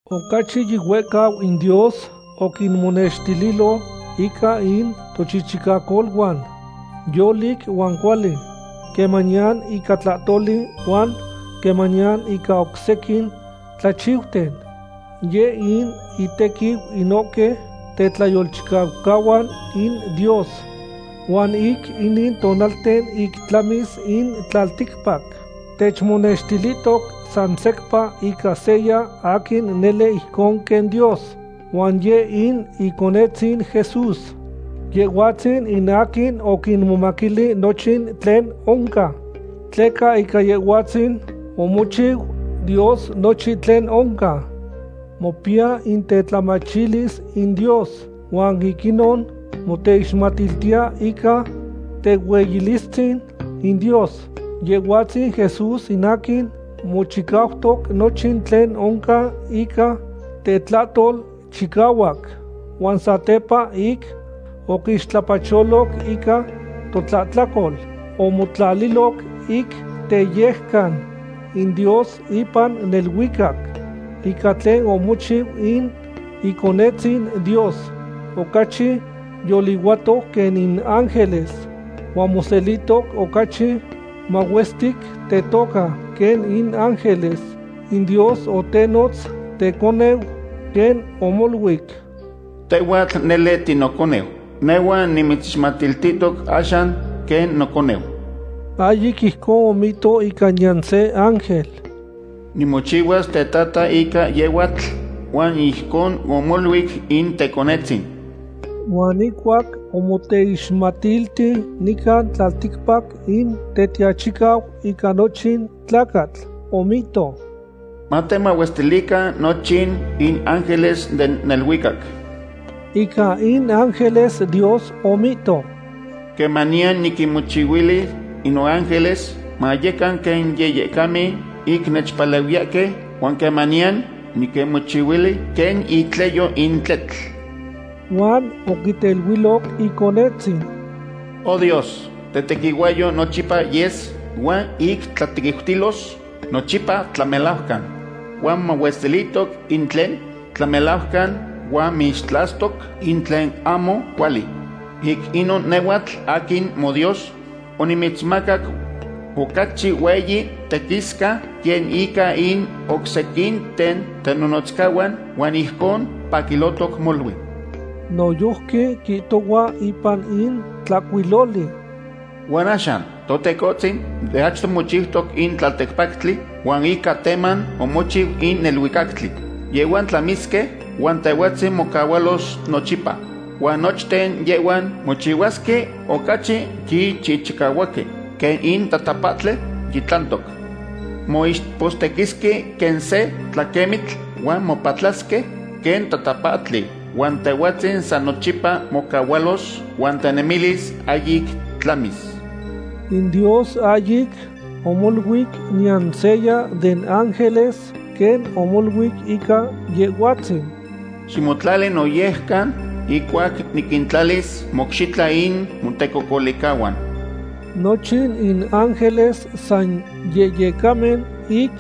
Ocachi yihuehcau in Dios oquinmonextililo ica in tochichicacoluan yolic huan cuali, quemaniyan ica tlahtoli huan quemaniyan ica oc sequin tlachiuten. Yeh in intequiu inohque tetlayolchicaucahuan in Dios. Huan ic inin tonalten ic tlamis in tlalticpac, techmonextilihtoc san secpa ica seya aquin nele ijcon quen Dios, huan yeh in Iconetzin Jesús. Yehhuatzin in aquin oquimomaquili nochin tlen oncan, tleca ica Yehhuatzin omochihualoc Dios nochin tlen oncan. Mopiya in tetlamachilis in Dios, huan ic inon moteixmatiltiya ica tehueyilistzin in Dios, Yehhuatzin Jesús in aquin mochicautoc nochin tlen oncan ica tetlahtol chicahuac. Huan satepa ic oquixtlapacholoc ica totlahtlacol, omotlaliloc ic teyejcan in Dios ipan neluicac. Ica tlen omochiu in Iconetzin Dios, ocachi yolihuatoc quen in ángeles, huan moselihtoc ocachi mahuestic tetoca quen in ángeles. In Dios otenotz teconeu, quen omoluic: Tehhuatl nele tinoconeu; nehhuatl nimitzixmatiltihtoc axan quen noconeu. Ahyic ijcon omihto ica niyan se ángel: Nimochihuas tetata ica yehhuatl, huan ijcon omoluic in Teconetzin. Huan ihcuac omoteixmatilti nican tlalticpac in Tetiachicau ica nochin tlacatl, omihto: Matemahuestilican nochin in ángeles den neluicac. Ica in ángeles Dios omihto: Quemaniyan niquinmochihuili in noángeles mayecan quen yehyecamen, ic nechpalehuiyahque, huan quemaniyan niquinmochihuili quen itleyo in tletl. Huan oquiteluiloc Iconetzin: Oh Dios, tetequihuahyou nochipa yes, huan ic tlatequiutilos nochipa tlamelajcan. Huan momahuestilihtoc in tlen tlamelajcan, huan mixtlastoc in tlen ahmo cuali. Ic inon nehhuatl aquin moDios onimitzmacac ocachi hueyi tequisca quen ica in oc sequinten tenonotzcahuan huan ijcon mopaquilohtoc molui. Noyojqui quihtohua ipan in tlahcuiloli: Huan axan, Totecohtzin, de achto mochiutoc in tlalticpactli, huan ica teman omochiu in neluicactli. Yehhuan tlamisque, huan Tehhuatzin mocahualos nochipa. Huan nochten yehhuan mochihuasque ocachi yichihchicahuaque quen in tatapahtli yitlantoc. Moixpostequisque quen se tlaquemitl huan mopatlasque quen tatapahtli. Huan Tehhuatzin san nochipa mocahualos, huan tenemilis ahyic tlamis. In Dios ahyic omoluic niyan seya den ángeles quen omoluic ica Yehhuatzin: Ximotlali noyejcan, ihcuac niquintlalis mocxitla in motecocolihcahuan. Nochin in ángeles san yehyecamen ic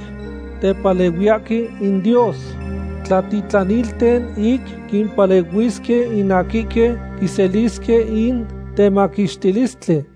tepalehuiyahque in Dios, tlatitlanilten ic quimpalehuisque in aquihque quiselisque in temaquixtilistli.